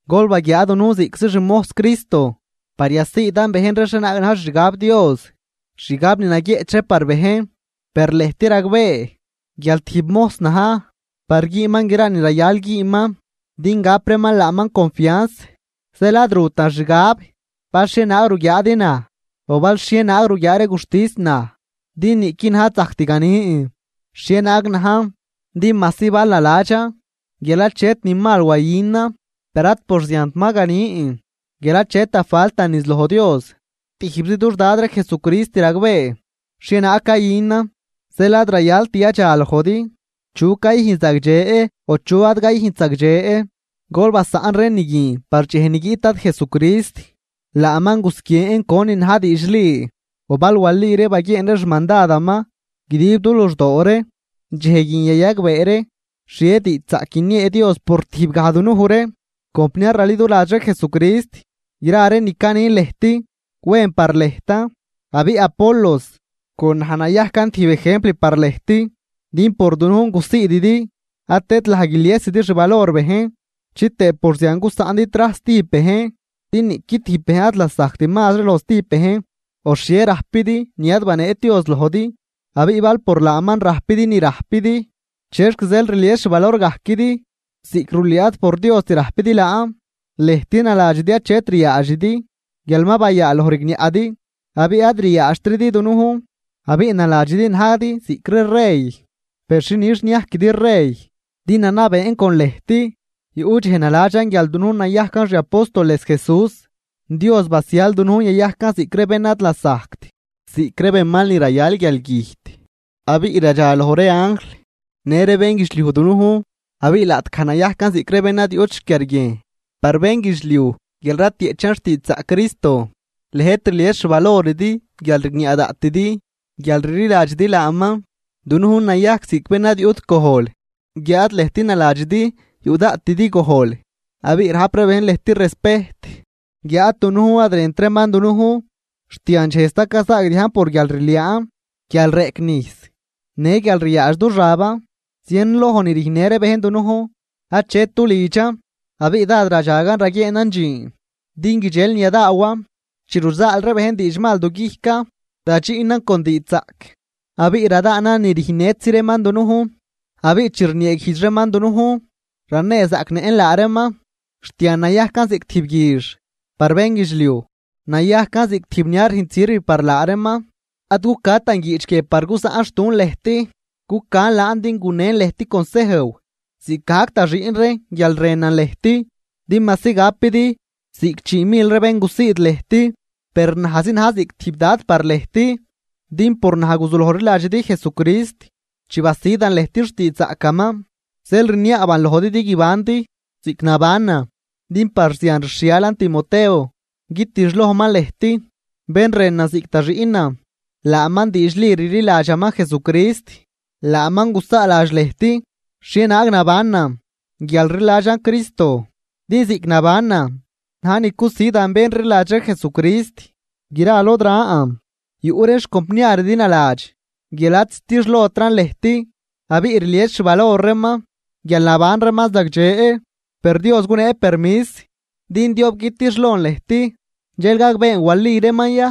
Gol baguiaa dunujn ziꞌctzi xmojs Cristo par yasiidan bejn ree xhienaag na̱j xixgab Dios, xgab ni naguieꞌch par bejn. Per lëjt ragbee guial tijb mojs na̱j par güünman gra ni rayal güünman din gap reeman laaman confianz. Zeel ad rutan xgab bal xhienaag ruguiaadi naj o bal xhienaag ruguiaa ree guxtis naj, din niꞌqui naj ad zajct ganin xhienaag najn. Din majsi bal naladxan guial achet ni mal wayünan per ad por ziant ma ganin guial achet da faltan niz loj Dios, tijbzi dux Dad ree Jesucrist ragbee xhienaag cayünan. Zeel ad rayalt yadxa lojdi chu cayüjn zagdxe o chu ad cayüjnt zagdxe, gol basaꞌn ree ni guin par dxej ni guiꞌt Dad Jesucrist. Laaman gusguien conin na̱j diidxli, o bal wali ree baguieen ree xmandadaman guidib du luxdoo ree, dxej guin yayagbee ree xhie diidxzaꞌc guiniee Dios por tijb gaj dunuj ree. Compniar raliduladx ree Jesucrist, gra ree ni canin lëjt wen par lëjtan. Abiꞌ Apolos con naj nayajcan tijb ejempl par lëjt, din por dunujn gusiididi ad tëdlaj guiliesidi xvalor bejn chitëë por zian gusaꞌndi trajs stijb bejn. Din niꞌqui tijb bejn ad lasajct mazri loj stijb bejn. ¿O xhie rajpidi ni ad baneet Dios lojdi? Abiꞌ bal por laaman rajpidi ni rajpidi, ¿chexc zeel rlies xvalorgajquidi ziꞌc rulüü ad por Diost rajpidi laan? Lëjt naladxidi achet ryaadxidi, guial ma bayaaloj rigniaꞌdi abiꞌ ad ryaadxtridi dunujn. Abiꞌ naladxidi najdi ziꞌc ree rey. ¡Per xinix niajquidi rey din nanabeen con lëjt! Yuꞌ dxej naladxan guial dunujn nayajcan xi apóstoles Jesús, Dios basial dunujn yayajcan ziꞌc ree bén ad lasajct, ziꞌc ree benmal ni rayal guialgüjt, abiꞌ radxaloj ree anjl në ree bénguidxliuj dunujn. Abiꞌ laꞌtgaj nayajcan ziꞌc ree bén ad yuꞌt xquiarguiejn par bénguidxliuj guial ratieꞌchan xtiidxzaꞌc Cristo, lëjt rlies xvaloridi guial rigniaꞌ daꞌtidi guial rliladxidi laaman. Dunujn nayajc ziꞌc bén ad yuꞌt gojl guiáad lëjt naladxidi yuꞌ daꞌtidi gojl abiꞌ rajp ree bejn lëjt respejt guiáad dunujn ad rënt reeman dunujn. Xt yandxej sta cayzaagdiajn por guialrliaan, guial reꞌc nijs në guial ryaadx du xaban. Zienloj ni rüjnnë ree bejn dunujn, achet du lidxan. Abiꞌ dád radxagan raguieenan dxiin din guidxel ni yadaawan. Chi ruzaal ree bejn diidxmal du guijcan radxiꞌnan con diidxzaꞌc, abiꞌ radaanan ni rüjnnëtzi reeman dunujn. Abiꞌ chi rnieeguijdx reeman dunujn, raneezaꞌcnëꞌn laa reeman. Xt yan nayajcan ziꞌc tijb guix par bénguidxliuj, nayajcan ziꞌc tijb ni ad rüjnt sirv par laa reeman. Ad cucatan guiꞌch guie par gusaꞌnxtun lëjt, cucan laan din gunen lëjt consejw ziꞌcgajc da xiꞌn reen guial rënan lëjt. Din majsi gapidi ziꞌc chii mil ree bén gusiid lëjt, per najzi na̱j ziꞌc tijb Dad par lëjt. Din por naj guzuloj rliladxidi Jesucrist chi basidan lëjt xtiidxzaꞌcaman. Zeel rniaaban lojdi din guibandi ziꞌc nabanan. Din par zian rxhialan Timoteo guitixlojman lëjt, bén rënan ziꞌc da xiꞌnan laaman diidxli rliladxaman Jesucrist. Laaman gusaaladx lëjt xhienaag nabanan guial rliladxan Jesucrist, din ziꞌc nabanan na̱j ni cusidan bén rliladx ree Jesucrist gra lod ran. Yuꞌ ree xcompniaridi naladx guial ad zitixlotran lëjt abiꞌ rlies xvalor reeman guial naban reeman zagdxe. Per Dios gunee permis din diob guitixlon lëjt dxel gagbeen wali reeman ya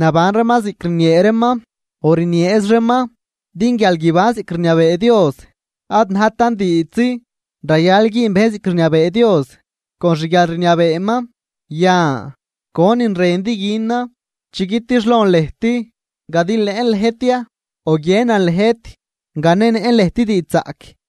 naban reeman ziꞌc rniee reeman o rnieez reeman. Din guial guiban ziꞌc rniabee Dios ad najtan diidxzi, rayal güün bejn ziꞌc rniabee Dios con xguialrniabeeman. Yan, ¿conin rëndi günan chi guitixlon lëjt, gadilëꞌn lëjt ya o guiënan lëjt ganenëꞌn lëjt diidxzaꞌc?